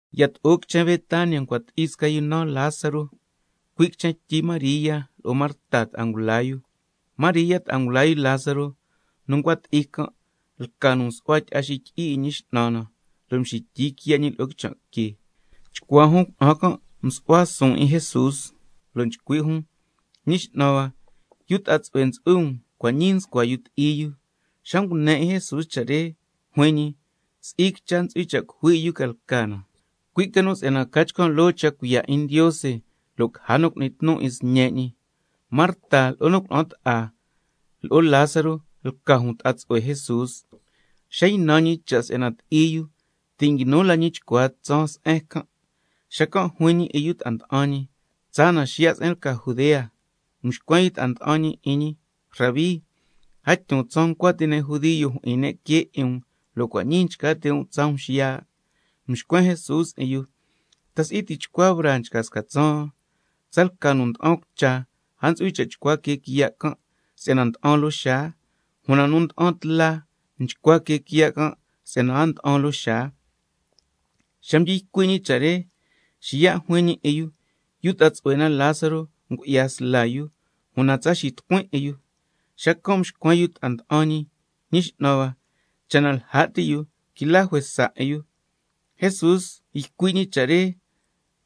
Yato'o quichen Betania ncua ti'i sca yu naan Lázaro, cui' quichen tyi María lo'o Marta ta'a ngula yu. (María ta'a ngula yu Lázaro nu ncua ti'i can', lca nu msu'hua tyi'a xityi'i 'in Ñi X'nan na, lo' mxityi quiya' ñi lo'o quichan' que.) Chcuaa jun cuna'an can' msu'hua suun 'in Jesús, lo' nchcui' jun: Ñi X'nan hua, yu ta'a tsu'hue ntsu'hui um, cua' ñii nscua yu ti'i yu. Xa ngune 'in Jesús cha' re, xacan' juin ñi: Si'i quicha ntsu'hui cha' cujui 'in yu ca lca na, cui' ca nu si'yana ca chcan' loo cha' cuiya' 'in Ndiose lo' caja nu cu'ni tnu 'in Sñe' ñi. Marta lo'o nu cuna'an ta'a, lo'o Lázaro lca jun ta'a tsu'hue Jesús. Xa ynan Jesús cha' si'yana yu can' ti'i yu, ti' nguinu la ñi chcua tsaan se'en can'. Xacan' juin ñi 'in yu ta'a nda'an ñi: Tsaa na xiya' se'en lca Judea. Mxcuen yu ta'a nda'an ñi 'in ñi: Rabí, a tyun tsaan ncua ti' ne' judio jyi'in ne' quee 'in um, lo' cua' ñii nchca ti' um tsaa um xiya'. Mxcuen Jesús 'in yu: ¿Ta si'i tichcua braa nchca sca tsaan? Tsalca nu nda'an cucha, a ntsu'hui cha' chcua quee quiya' can' si'yana nda'an loo xaa. Una nu nda'an tla, nchcua quee quiya' can' si'yana a nda'an loo xaa. Xa mdyi ycui' ñi cha' re, xiya' juin ñi 'in yu: Yu ta'a tsu'hue na Lázaro ngu'ya sla yu, una cua' ñii tsa xitucuin 'in yu. Xacan' mxcuen yu ta'a nda'an ñi: Ñi X'nan hua, cha' na lja' ti yu, quila juesa 'in yu. Jesús nchcui' ñi cha' re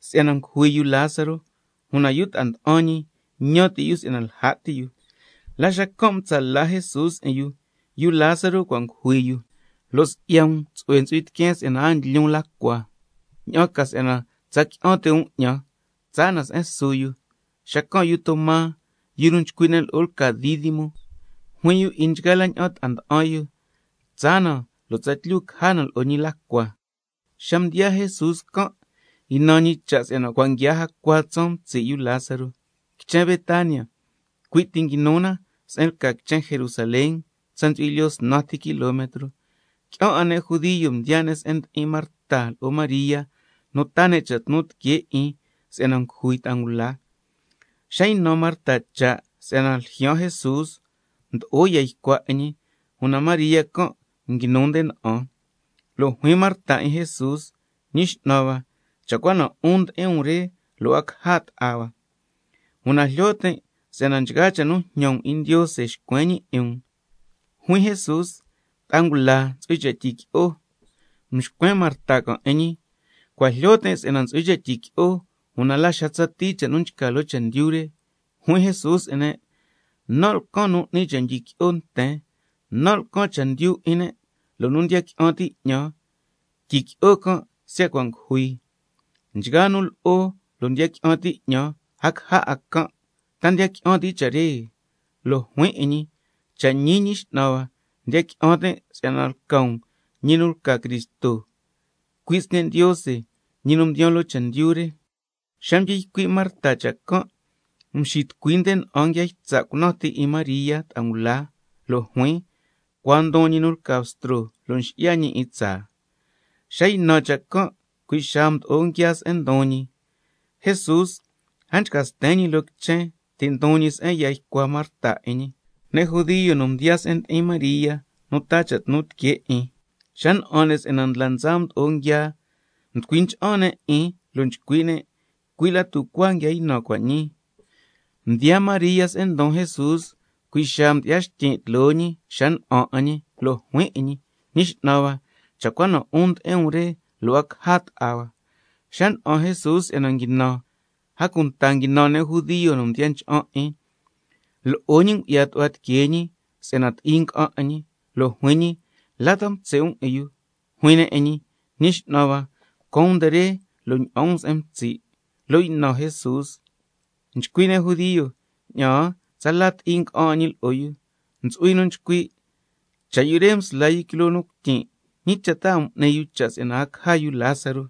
si'yana ngujui yu Lázaro, una yu ta'a nda'an ñi ñan ti' yu si'yana lja' ti yu. La xacan' mtsa' la ca Jesús 'in yu: Yu Lázaro cua' ngujui yu, lo' si'ya um tsu'hue ntsu'hui tiqueen si'yana a ndlyun la cua, ña'an ca si'yana tsa qui'an ti' um 'ñan, cua' ñii tsaa na se'en su yu. Xacan' yu Toma, nu nchcui' ne' lo'o lca Dídimo, juin yu lo'o nchgaa la ña'an ta'a nda'an yu: Tsaa na, lo' tsatlyu caja na lo'o ñi la cua. Xa mdiyaa Jesús can' ynan ñi cha' si'yana cua' nguiaa jacua tsaan mtsi' yu Lázaro. Quichen Betania, cui' ti nguinu na se'en lca quichen Jerusalén, tsa ntsu'hui lyoo snan ti kilometro. Qui'an 'a ne' judio mdiyaa ne' se'en ndi'in Marta lo'o María, nu taa ne' cha' tnu tiquee 'in si'yana ngujui yu ta'a ngula. Xa ynan Marta cha' si'yana cua' ljyaan Jesús, mdo'o ya ycua 'in ñi, una María can' nguinu nde na'an. Lo' juin Marta 'in Jesús: Ñi X'nan hua, cha' cua na 'un ndi'in um re, lo' a caja ta'a hua. Una jlyo tin' si'yana nchgaa cha' nu njñan um 'in Ndiose nxcuen ñi 'in um. Juin Jesús: Una ta'a ngula ntsu'hui cha' tyiqui'o. Mxcuen Marta can' 'in ñi: Cua' jlyo tin' si'yana ntsu'hui cha' tyiqui'o, una la xa tsatii cha' nu nchca loo chendyu re. Xacan' juin Jesús 'in ne': Nan' lcan nu n'ni cha' ndyiqui'o nten, nan' lcan chendyu 'in ne', lo' nu ndiya qui'an ti' 'ñan, tyiqui'o can' siya' cua' ngujui. Nchgaa nu lo'o lo' ndiya qui'an ti' 'ñan, a caja 'a can'. ¿Ta ndiya qui'an ti' cha' re? Lo' juin 'in ñi: Cha' ñi, Ñi X'nan hua, ndiya qui'an tin' si'yana lca um ñi nu lca Cristo, cui' Sñe' Ndiose nu mdiyaan loo chendyu re. Xa mdyi ycui' Marta cha' can', mxitucui nde na'an nguia ytsa' cunan ti 'in María ta'a ngula, lo' juin: Cua ndon ñi nu lca Bstro lo' nxi'ya ñi 'in tsaa. Xa ynan cha' can', cui' xaa mdo'o nguiaa se'en ndon ñi. Una Jesús a nchca sten ñi loo quichen, ti' ndon ñi se'en ya ycua Marta 'in ñi. Ne' judio nu mdiyaa se'en ndi'in María nu taa cha' tnu tiquee 'in, xa na'an ne' si'yana ndla ndsa mdo'o nguiaa, mducui ncha'an ne' 'in lo' nchcui' ne': Cui' la tucuaa nguia ynan cua' ñii. Xa mdiyaa María se'en ndon Jesús, cui' xaa mdyi'ya xtyin' tloo ñi xa na'an 'in ñi, lo' juin 'in ñi: Ñi X'nan hua, cha' cua na 'un ndi'in um re, lo' a caja ta'a hua. Xa na'an Jesús si'yana nguinan, a cunta nguinan ne' judio nu mdiya ncha'an 'in, lo'o ñi ngu'ya tu'hua tiquee ñi si'yana ti'i nga'an 'in ñi. Lo' juin ñi: ¿La ta mtsi' um 'in yu? Juin ne' 'in ñi: Ñi X'nan hua, caan um nde re lo' ña'an um se'en mtsi'. Lo' ynan Jesús. Nchcui' ne' judio: Ña'aan, tsala ti'i nga'an 'in ñi lo'o yu. Ntsu'hui nu nchcui': Cha' yu re msla quiloo yu cuityin' can', ¿ñi cha' ta a m'ni yu cha' si'yana a caja yu Lázaro?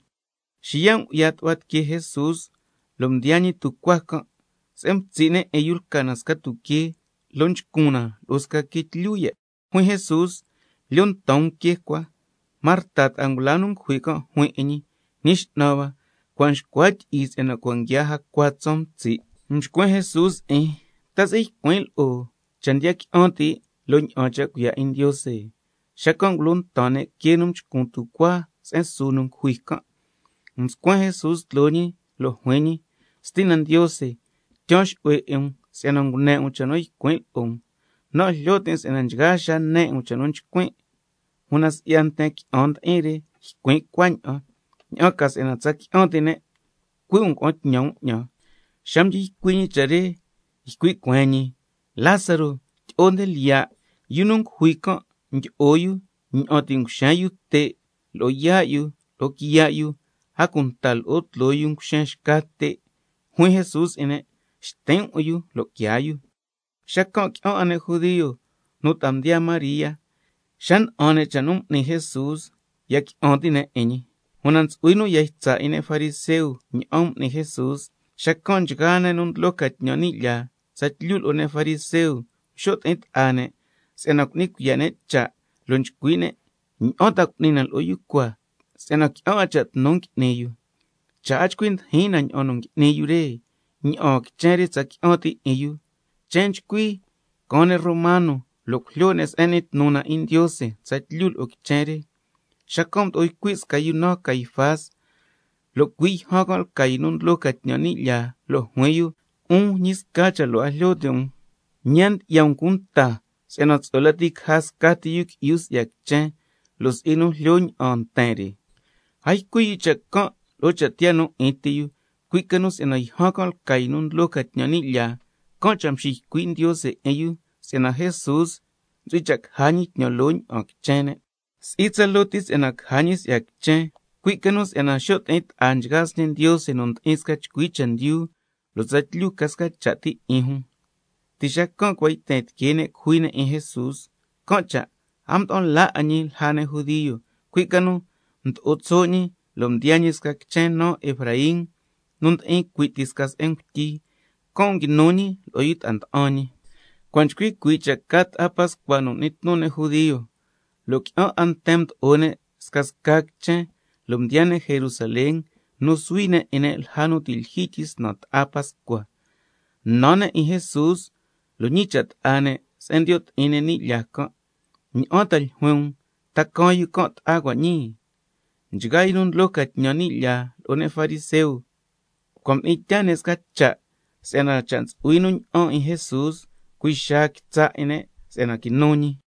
Xiya' ngu'ya tu'hua tiquee Jesús, lo' mdiyaa ñi tucuaa can'. Se'en mtsi' ne' 'in yu lca na sca tuquee, lo' nchcun na lo'o sca quee tlyu ya'. Xacan' juin Jesús: Lyo ntan um quee cua. Marta ta'a ngula nu ngujui can' juin 'in ñi: Ñi X'nan hua, una cua' nxcua tyi'i si'yana cua' nguiaa jacua tsaan mtsi'. Mxcuen Jesús 'in: ¿Ta si'i can' cha' nen lo'o cha' ndiya qui'an ti', lo' ña'an cha' cuiya' 'in Ndiose? Xacan' ngulo ntan ne' quee nu nchcun tucuaa se'en su yu ngujui can'. Mscuen Jesús tloo ñi nde cuaan, lo' juin ñi: Stina Ndiose, tyaan xu'hue 'in um si'yana ngune 'in um cha' nu ycuin' lo'o um. Nan' jlyo tin' si'yana nchgaa xaa ne 'in um cha' nu nchcuin', una si'ya nten qui'an ndi'in re ycuin' cuaña'an, ña'an ca si'yana tsa qui'an ti' ne' cui' um ngua'an tñan um 'ñan. Xa mdyi ycui' ñi cha' re ycui' cueen ñi: Lázaro, tyi'o nde lyiya'. Yu nu ngujui can' mdyi'o yu ña'an ti' nguixen yu te' lo'o yaa' yu lo'o quiya' yu, a cunta lo'o tloo yu nguxen xca te'. Juin Jesús 'in ne': Xtin' um 'in yu lo' quiaa yu. Xacan' qui'an 'a ne' judio nu ta'a mdiyaa María, xa na'an ne' cha' nu m'ni Jesús ya qui'an ti' ne' 'in ñi. Una ntsu'hui nu ya ytsa' 'in ne' fariseo ña'an m'ni Jesús. Xacan' nchgaa nu ndlo ca tñan ni' lyaa, tsatlyu lo'o ne' fariseo mxo' ti'in ta'a ne' si'yana cu'ni cuiya' ne' cha', lo' nchcui' ne': ¿Ña'an ta cu'ni na lo'o yu cua, si'yana qui'an 'a cha' tnu ngui'ni yu? Cha' a chcui ndijin na ña'an ngui'ni yu re, ña'aan quichen re tsa qui'an ti' 'in yu, chen nchcui caan ne' romano lo' cujlyo ne' se'en n'ni tnu na 'in Ndiose tsatlyu lo'o quichen re. Xacan' mdo'o ycui' sca yu naan Caifás, lo' cui' yjan can' lca yu nu ndlo ca tñan ni' lyaa, lo' juin yu: 'Un ñi sca cha' lo' a jlyo ti' um, ñi a ndyi'ya um cunta si'yana tsu'hue lati caja scati yu qui'yu si'ya quichen, lo' si'i nu jlyo ña'aan nten re. A ycui' yu cha' can' lo'o cha' tiyaa nu 'in ti yu, cui' ca nu si'yana yjan can' lca yu nu ndlo ca tñan ni' lyaa, can' cha' mxiycui' Ndiose 'in yu si'yana Jesús ntsu'hui cha' caja ñi tñan loo ña'aan quichen ne'. Si'i tsaloo ti si'yana caja ñi si'ya quichen, cui' ca nu si'yana xo' ti'in ta'a nchgaa sñe' Ndiose nu ndi'in sca chcui chendyu, lo' tsatlyu ca sca cha' ti 'in jun. Ti' xacan' cua' yten tiquee ne' cujui ne' 'in Jesús. Can' cha' Jesús a mda'an la 'a ñi lja ne' judio, cui' ca nu mdo'o tso' ñi lo' mdiyaa ñi sca quichen naan Efraín nu ndi'in cui' ti sca se'en ngutyi, can' nguinu ñi lo'o yu ta'a nda'an ñi. Cua' nchcui cuii' cha' ta'a Pascua nu n'ni tnu ne' judio, lo' qui'an 'a nten mdo'o ne' scasca quichen, lo' mdiyaa ne' Jerusalén nu suhui ne' 'in ne' lja nu ti' lyijyi tyisnan ta'a Pascua. Nan ne' 'in Jesús, lo' scasca ne' ñicha' ta'a ne' se'en ndiyo' ti'in ne' ni' lyaa can': ¿Ña'an ta ljuin um, ta caan yu can' ta'a cua' ñii? Nchgaa yu nu ndlo ca tñan ni' lyaa lo'o ne' fariseo, cua' mdi'in tyaa ne' sca cha' si'yana cha' ntsu'hui nu ña'an 'in Jesús cui' xaa quitsa' 'in ne' si'yana quinu ñi.